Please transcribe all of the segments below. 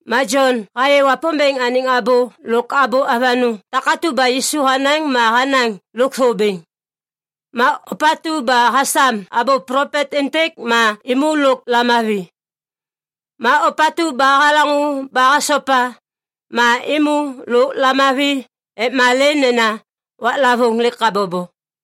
Ma Jon hayê Wapômbêŋ anêŋ abô lôk abô avanôŋ takatu ba Yisu hanaŋ ma hanaŋ lôkthô bêŋ. Ma ôpatu ba hasam abô plopet êntêk ma êmô lôk lamavi. Ma ôpatu ba halaŋô ba hasopa ma êmô lôk lamavi ek malê nena waklavôŋ lêk habobo.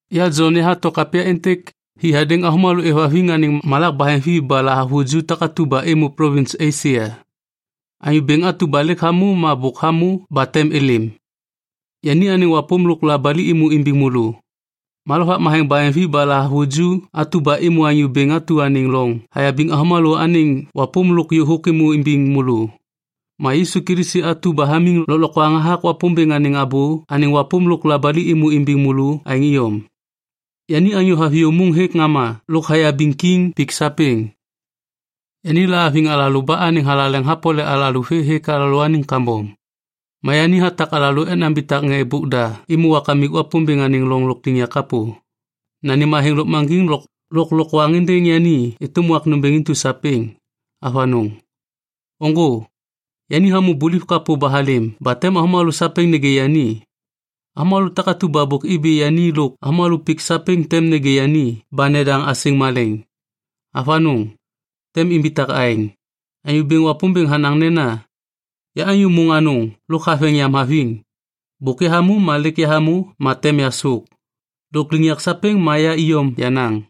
Ya Jon yahato kapya êntêk hi hadêŋ avômalô êvhaviŋ anêŋ malak baheŋvi ba lahavuju takatu ba êmô plovins Esia. Anyô Bêŋ atu ba lêk hamô ma bôk hamô ba tem êlêm, yani anêŋ wapôm lôk labali êmô imbiŋ môlô. Ma lovak matheŋ baheŋvi ba lahavuju atu ba êmô Anyô Bêŋ atu anêŋ loŋ hayabiŋ avômalô anêŋ wapôm lôk yôhôk êmô imbiŋ môlô. Ma Yisu Kilisi atu ba hamiŋ lôklokwaŋ hathak Wapômbêŋ anêŋ abô anêŋ wapôm lôk labali êmô imbiŋ môlô aêŋ iyom. Yani anyô haviyô môŋ hêk ŋama lôk hayabiŋ kiŋ pik sapêŋ. Yani lahaviŋ alalô ba anêŋ thalaleŋ hapole alalô vê hêk alalôaniŋ kambom. Ma yani hatak alalô ek nambitak ŋê nambôk da êmô Kamik Wapômbêŋ anêŋ loŋ lôkliŋyak kapô. Nanêm athêŋ lôkmaŋgiŋ lôk lôklokwaŋ êndêŋ yani êtôm wak nômbêŋ intu sapêŋ. Avanôŋ. Ôŋgô! Yani hamô buliv kapô ba halêm ba tem avômalô sapêŋ nêgê yani. Avômalô takatu ba bôk ibi yani lôk avômalô pik sapêŋ tem nêgê yani ba nedaŋ asêŋ malêŋ. Avanôŋ, tem imbitak aêŋ. Anyô Bêŋ Wapômbêŋ hanaŋ nena, “Ya anyô môŋ anôŋ lôk haveŋ yam haviŋ. Bôk yahamô ma lêk yahamô ma tem yasôk. Lôkliŋyak sapêŋ ma ya iyom yenaŋ.”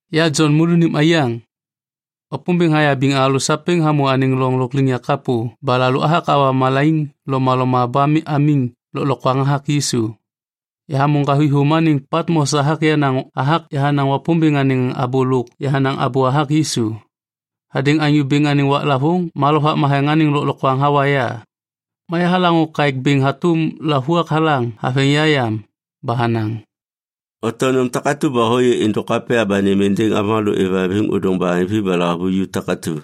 Ya Jon môlônim aiyaŋ. Wapômbêŋ hayabiŋ alalô sapêŋ hamô anêŋ loŋ lôkliŋyak kapô ba alalô athak awa malaiŋ lomaloma ba amiŋ lôklokwaŋ hathak Yisu. Yahamô ŋgavithôm anêŋ Patmos hathak yahanaŋ Wapômbêŋ anêŋ abô lôk yahanaŋ abô hathak Yisu. Hadêŋ Anyô Bêŋ anêŋ waklavôŋ ma Lovak Matheŋ anêŋ lôklokwaŋ hawa ya. Ma yahalaŋô kaêk bêŋ hatôm lavuak halaŋ haveŋ ya yam ba hanaŋ, “Oto nôm takatu ba hôyê êndôk kapya ba nêm êndêŋ avômalô êvhaviŋ ôdôŋ baheŋvi ba lahavuju takatu.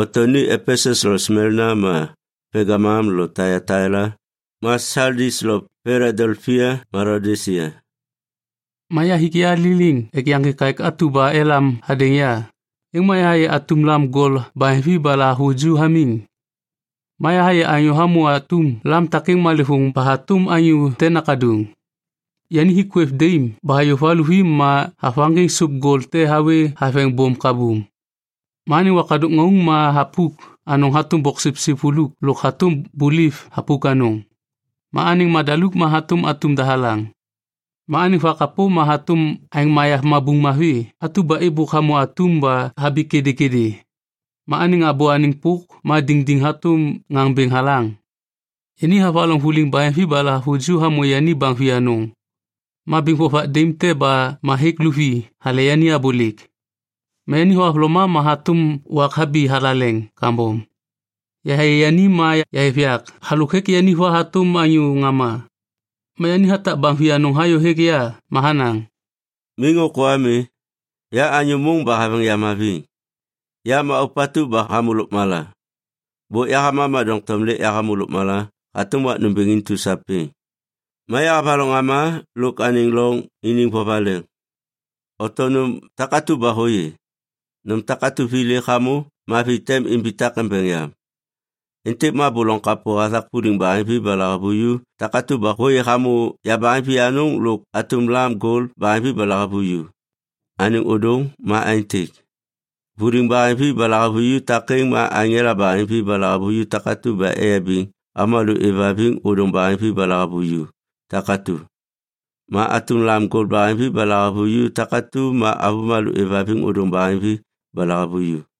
Oto ni Epesus lo Smelna ma Pelgamum lo Taiataila ma Saldis lo Piladelpia ma Laodisia.” Ma yahik ya liliŋ ek yaŋgê kaêk atu ba elam hadêŋ ya, êŋ ma yahayê atum lam gol baheŋvi ba lahavuju hamiŋ. Ma yahayê anyô hamô atum lam takêŋ malêvôŋ ba hatôm anyô te nakaduŋ. Yani hik kwêv daim ba hayô va luvi ma havaŋgiŋ sôp gol te hawê haveŋ bôm kabum. Ma anêŋ wakadôk ŋauŋ ma thapuk anôŋ hatôm boksipsip vuluk lôk hatôm buliv thapuk anôŋ. Ma anêŋ madaluk ma hatôm atum dahalaŋ. Ma anêŋ vakapô ma hatôm aeŋ mayav mabuŋ mavi atu ba êbôk hamô atum ba habi kêdêkêdê. Ma anêŋ abô anêŋ pôk ma diŋdiŋ hatôm ŋaŋ bêŋ halaŋ. Yani havaloŋ vuliŋ baheŋvi ba lahavuju hamô yani baŋ vianôŋ. Ma biŋ vovak daim te ba ma hêk luvi hale yani abôlêk. Ma yani thohavloma ma hatôm wak habi mathalaleŋ kambom. Yahayê yani ma yahêv yak halôk hêk yani va hatôm anyô ŋama. Ma yani hatak baŋ vianôŋ hayô hêk ya ma hanaŋ, “Miŋ ôkô ami. Ya anyô môŋ ba haveŋ yam haviŋ. Ya ma ôpatu ba hamô lôkmala. Bôk yahama ma doŋtom lêk yahamô lôkmala hatôm wak nômbêŋ intu sapêŋ. Ma yahavaloŋ ŋama lôk anêŋ loŋ iniŋ vovaleŋ. Oto nôm takatu ba hôyê. Nôm takatu vi lêk hamô ma vi tem imbitak embeŋ yam. Êntêk ma abô loŋ kapô hathak vuliŋ baheŋvi ba lahavuju takatu ba hôyê hamô yabaheŋ vianôŋ lôk atum lam gol baheŋvi ba lahavuju. Anêŋ ôdôŋ ma aêntêk: vuliŋ baheŋvi ba lahavuju takêŋ ma aŋela baheŋvi ba lahavuju takatu ba eyabiŋ avômalô êvhaviŋ ôdôŋ baheŋvi ba lahavuju takatu. Ma atum lam gol baheŋvi ba lahavuju takatu ma avômalô êvhaviŋ ôdôŋ baheŋvi ba lahavuju.”